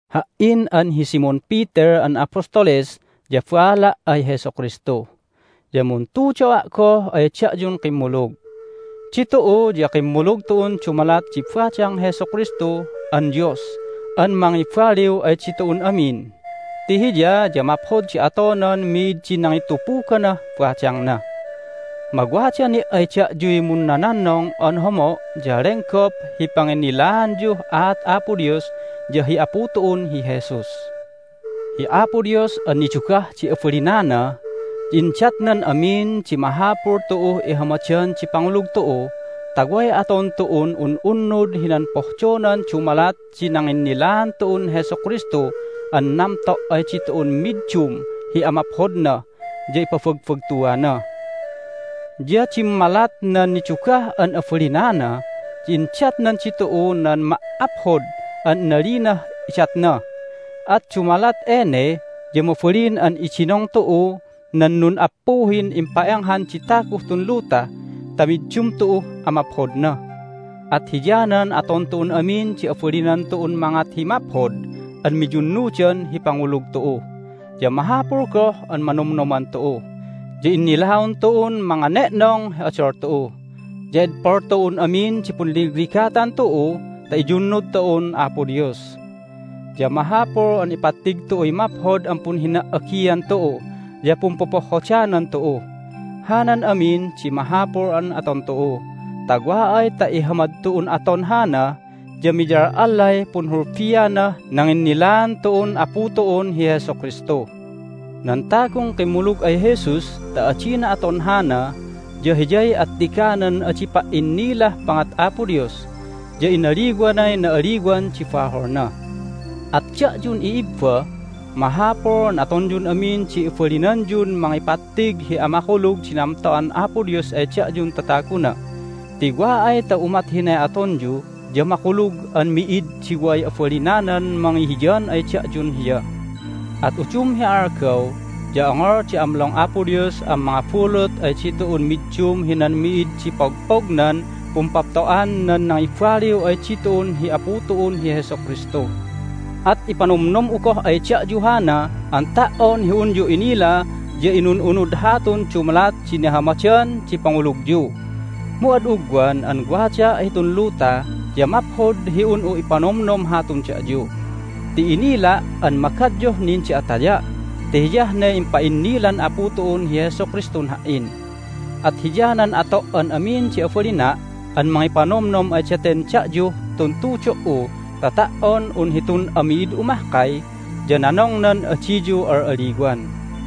Ha"in an hi Simon Peter an apostoles ya baala' ay Jesu Kristu, ya muntudo'a' goh ay da'yun kimmulug. Ditu'u ya kimmulug tu'un dumalat di badang Jesu Kristu an Dios an mangibaliw ay ditu'un amin ti Hiya ya maphod di atonan mi'id di nangitupuganah badangna. Mawada ni' ay da'yuy munnononnong an homo' ya lenggop hi panginnilaanyuh aat Apo Dios ya hi Apu tu'un hi Jesus. Hi Apo Dios an nidugah di abalinana ya indatnan amin di mahapul tu'uh ihamadan di pangulug tu'u ta way aton tu'un un'unnud hinan pohdonan dumalat di nanginnilaan tu'un Jesu Kristu an namto' ay ditu'un middum hi amaphodna ya ipabagbagtuana. Ya dimmalat nan nidugah an abalinana ya indatnan ditu'u nan ma"aphod an inalinah idatna. At dumalat ene ya mabalin an idinong tu'u nan nun'appuhin impa'enghan di taguh tun luta ta middum tu'uh amaphodna. At hiyanan aton tu'un amin di abalinan tu'un mangat hi maphod an miyunnudan hi pangulug tu'u. Ya mahapul goh an manomnoman tu'u, ya innilaon tu'un mangane'nong hi odol tu'u, ya edpol tu'un amin di punligligatan tu'u ta iyunnud tu'un Apo Dios. Ya mahapul an ipattig tu'uy maphod an punhina"agian tu'u ya pumpopohhodanan tu'u. Hanan amin di mahapul an aton tu'u ta wa ay ta ihamad tu'un aton hana ya miyal'allay punhulbianah nanginnilaan tu'un Apu tu'un hi Jesu Kristu. Nan tagun kimmulug ay Jesus ta adina aton hana ya hiyay attiganan adi pa"innilah pangat Apo Dios, ya inaliwanay na'aliwan di baholna. At da'yun i'ibba, mahapul an atonyun amin di abalinanyun mangipattig hi amakulug di namto'an Apo Dios ay da'yun tataguna ti wa ay ta umat hinay atonyu ya makulug an mi'id di way abalinanan mangihiyan ay da'yun Hiya. At udum hi algaw ya ongol di amlong Apo Dios an mangabulut ay ditu'un middum hinan mi'id di pogpognan pumpapto'an nan nangibaliw ay ditu'un hi Apu tu'un hi Jesu Kristu. At ipanomnom'u goh ay da'yu hana an ta"on hi unyu inila ya inun'unud hatun dumalat di nihamadan di pangulugyu. Mu ad ugwan an wadaa' hitun luta ya maphod hi un'u ipanomnom hatun da'yu ti inila' an magadyuh nin di ataya' ti hiyah ne impa'innilan Apu tu'un hi Jesu Kristun ha"in. At hiyanan ato' an amin di abalina' an mangipanomnom ay daten da'yuh tun tudo"u ta ta"on un hitun ami'id'u mahkay ya nanongnan adiyu al'alliwan.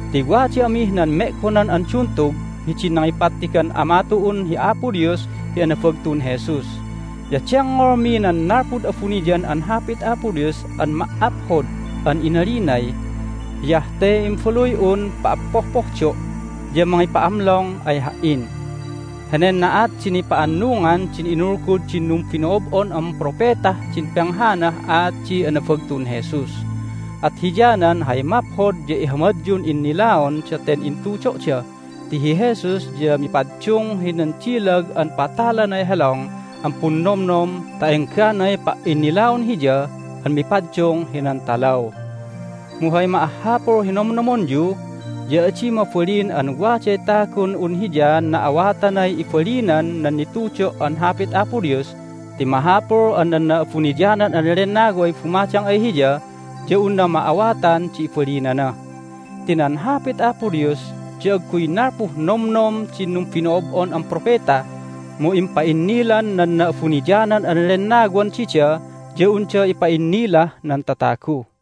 Ti wada amih nan me'gonan an duntug hidin nangipattigan Ama tu'un hi Apo Dios hi anabagtun Jesus. Ya dengngolmi nan nalpud abuniyan an Hapit Apo Dios an ma"aphod an inalinay, "Hiyah te Imbaluy'un pa'appohpohdo' ya mangipa'amlong ay Ha"in!" Henen na'at di nipa'annungan din inulgud din numbino'ob'on an propetah din penghanah aat di anabagtun Jesus. At hiyanan hay maphod ya ihamadyun innilaon daten intudo'da ti hi Jesus ya mipaddung hinan dilag an patalanay helong an punnomnom ta engganay pa"innilaon Hiya an mipaddung hinan talaw. Mu hay ma'ahhapul hi nonomnomonyu ya adi mabalin an waday tagun un hiyaan na'awatanay ibalinan nan nitudo' an Hapit Apo Dios ti mahapul an nan Na'abuniyanan an Lennaway bumadang ay hiya ya unna ma'awatan di ibalinana. Ti nan Hapit Apo Dios ya agguy nalpuh nomnom din numbino'ob'on an propeta, mu impa'innilan nan Na'abuniyanan an Lennawan dida ya unda ipa'innilah nan tatagu.